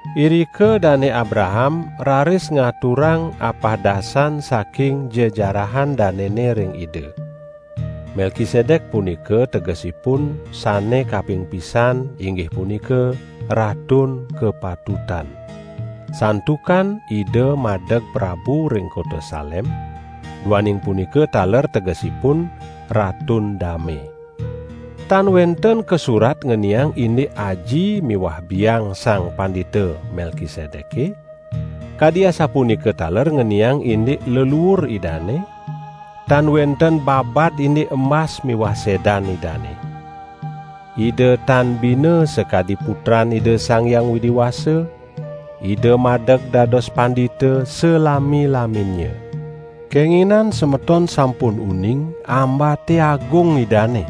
Irika Dane Abraham raris ngaturang apahdasan saking jejarahan danene ring ida. (Melkisedek punika tegesipun, sane kaping pisan inggih punika: "Ratun Kapatutan". Santukan ida madeg prabu ring kota Salem, duaning punika taler tegesipun: "Ratun Dame".) Tan wenten kasurat ngeniang indik aji miwah biang Sang Pandita Melkisedeke, kadi asapunika taler ngeniang indik leluur idane; tan wenten babad indik embas miwah sedan idane. Ida tan bina sakadi Putran Ida Sang Hyang Widi Wasa; ida madeg dados pandita salami-laminnya. Kenginan semeton sampun uning ambate agung idane.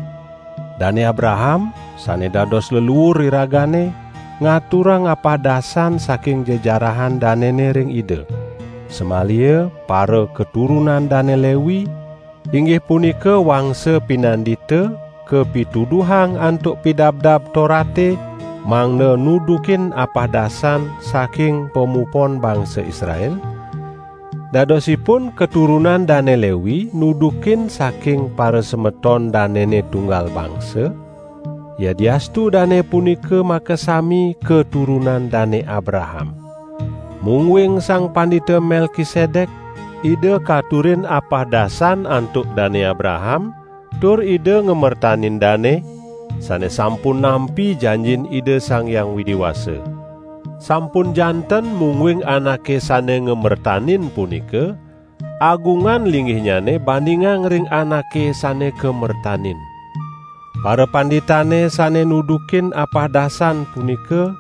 Dane Abraham, sane dados leluur iragane, ngaturang apahdasan saking jejarahan danene ring ida. Samaliha parakaturunan Dane Lewi, inggih punika wangsa pinandita, kapituduhang antuk Pidabdab Torate mangda nudukin apahdasan saking pamupon bangsa Israel -- dadosipun katurunan Dane Lewi nudukin saking parasemeton danene tunggal bangsa, yadiastu dane punika makasami katurunan Dane Abraham. Mungguing Sang Pandita Melkisedek, ida katurin apahdasan antuk Dane Abraham tur ida ngamertanin dane, sane sampun nampi janjin Ida Sang Hyang Widi Wasa. Sampun janten mungguing anake sane ngamertanin punika, agungan linggihnyane bandingang ring anake sane kamertanin. Parapanditane sane nudukin apahdasan punika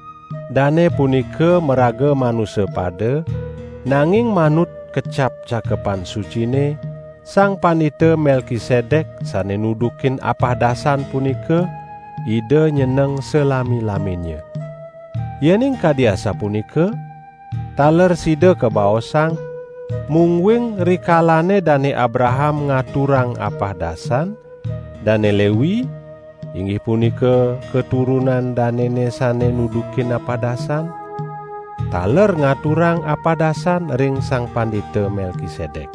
dane punika maraga manusa pada, nanging manut kecap Cakepan Sucine: Sang Pandita Melkisedek sane nudukin apahdasan punika, ida nyeneng salami-laminnya! Yening kadi asapunika, taler sida kabaosang, mungguing rikalane Dane Abraham ngaturang apahdasan, Dane Lewi, (inggih punika katurunan danene sane nudukin apahdasan) taler ngaturang apahdasan ring Sang Pandita Melkisedek.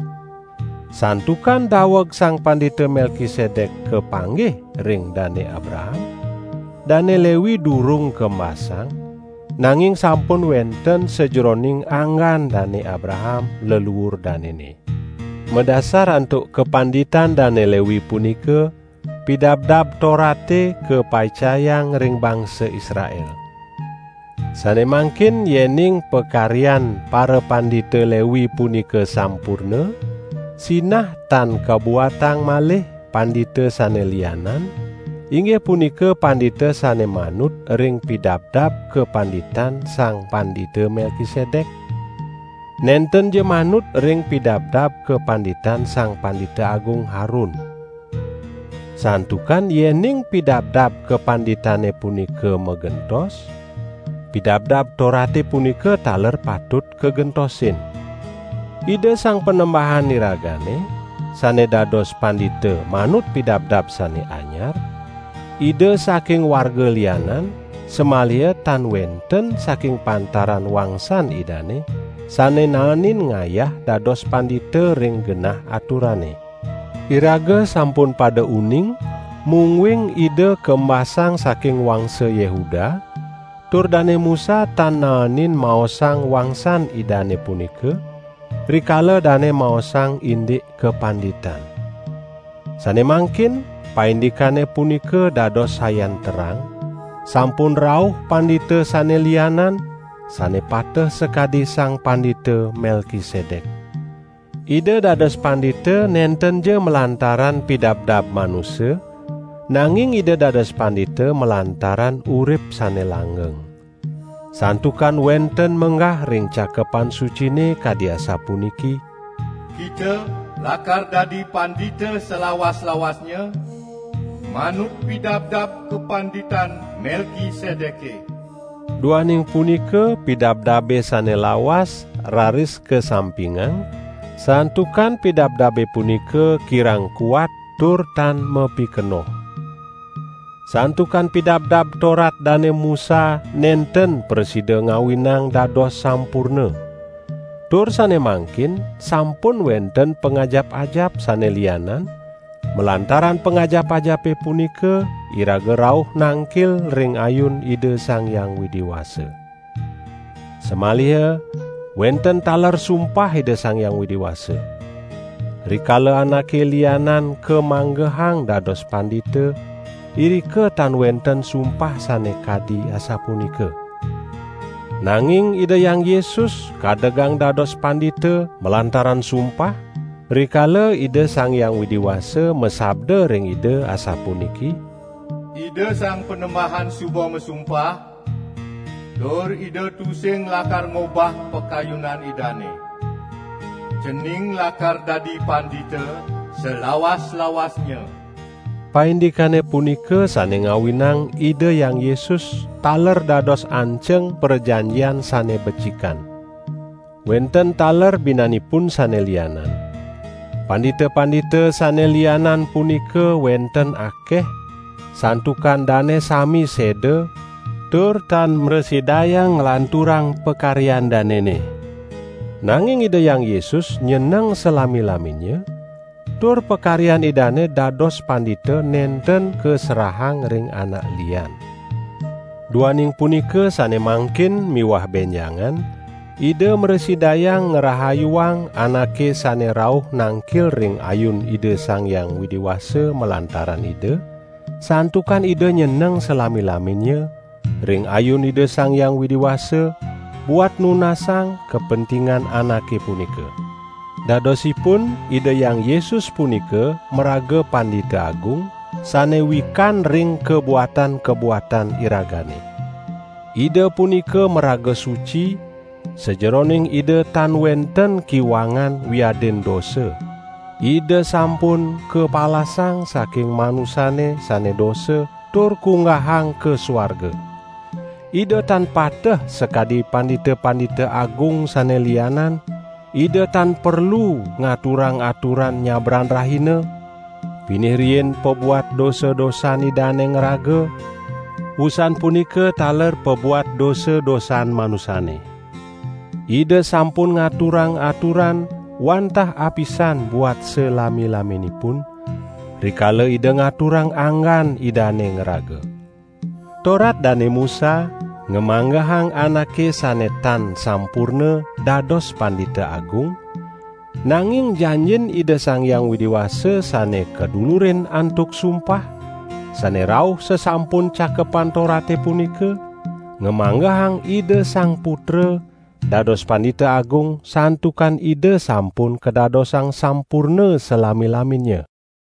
Santukan daweg Sang Pandita Melkisedek kapanggih ring Dane Abraham, Dane Lewi durung kembasang, nanging sampun wenten sajeroning anggan Dane Abraham, leluur danene. Madasar antuk kapanditan Dane Lewi punika, Pidabdab Torate kapaicayang ring bangsa Israel. Sane mangkin yening pakaryan parapandita Lewi punika sampurna, sinah tan kabuatang malih pandita sane lianan, inggih punika pandita sane manut ring pidabdab kapanditan Sang Pandita Melkisedek, nentenja manut ring pidabdab kapanditan Sang Pandita Agung Harun. Santukan yening pidabdab kapanditane punika magentos, Pidabdab Torate punika taler patut kagentosin. Ida Sang Panembahan iragane, sane dados pandita manut pidabdab sane anyar, Ida saking warga lianan, samaliha tan wenten saking pantaran wangsan Idane sane naenin ngayah dados pandita ring genah aturane. Iraga sampun pada uning mungguing Ida kembasang saking wangsa Yehuda; tur Dane Musa tan naenin maosang wangsan Idane punika, rikala dane maosang indik kapanditan. Sane mangkin paindikane punika dados sayan terang; sampun rauh pandita sane lianan, sane pateh sakadi Sang Pandita Melkisedek. Ida dados pandita nentenja malantaran pidabdab manusa, nanging Ida dados pandita malantaran urip sane langgeng. Santukan wenten menggah ring Cakepan Sucine kadi asapuniki: "Kita lakar dadi pandita salawas-lawasnya, manut pidabdab Kapanditan Melkisedeke." Duaning punika pidabdabe sane lawas raris kasampingang, santukan pidabdabe punika kirang kuat tur tan mapikenoh. Santukan Pidabdab Torat Dane Musa nenten prasida ngawinang dados sampurna. Tur sane mangkin sampun wenten pangajap-ajap sane lianan, malantaran pangajap-ajape punika iraga rauh nangkil ring ayun Ida Sang Hyang Widi Wasa. Samaliha, wenten taler sumpah Ida Sang Hyang Widi Wasa. Rikala anake lianan kamanggehang dados pandita, irika tan wenten sumpah sane kadi asapunika. Nanging Ida Hyang Yesus kadegang dados pandita malantaran sumpah, rikala Ida Sang Hyang Widi Wasa masabda ring Ida asapuniki: "Ida Sang Panembahan suba masumpah, tur Ida tusing lakar ngobah pakayunan Idane: 'Cening lakar dadi pandita salawas-lawasnya.' " Paindikane punika sane ngawinang Ida Hyang Yesus taler dados anceng prajanjian sane becikan. Wenten taler binanipun sane lianan: Pandita-pandita sane lianan punika wenten akeh, santukan dane sami seda, tur tan mrasidayang nglanturang pakaryan danene. Nanging Ida Hyang Yesus nyeneng salami-laminnya, tur pakaryan Idane dados pandita nenten kaserahang ring anak lian. Duaning punika sane mangkin miwah benjangan, Ida mrasidayang ngrahayuang anake sane rauh nangkil ring ayun Ida Sang Hyang Widi Wasa malantaran Ida, santukan Ida nyeneng salami-laminnya ring ayun Ida Sang Hyang Widi Wasa buat nunasang kapentingan anake punika. Dadosipun Ida Hyang Yesus punika maraga Pandita Agung, sane wikan ring kabuatan-kabuatan iragane. Ida punika maraga suci; sajeroning Ida tan wenten kiwangan wiadin dosa; Ida sampun kapalasang saking manusane sane dosa tur kunggahang ka suarga. Ida tan pateh sakadi pandita-pandita agung sane lianan; Ida tan perlu ngaturang aturan nyabran rahina, pinih riin pabuat dosa-dosan Idane ngraga, wusan punika taler pabuat dosa-dosan manusane. Ida sampun ngaturang aturan, wantah apisan buat salami-laminipun, rikala Ida ngaturang anggan Idane ngraga. Torat Dane Musa ngamanggehang anake sane tan sampurna dados Pandita Agung; nanging janjin Ida Sang Hyang Widi Wasa sane kadulurin antuk sumpah, sane rauh sasampun Cakepan Torate punika, ngamanggehang Ida Sang Putra, dados Pandita Agung, santukan Ida sampun kadadosang sampurna salami-laminnya.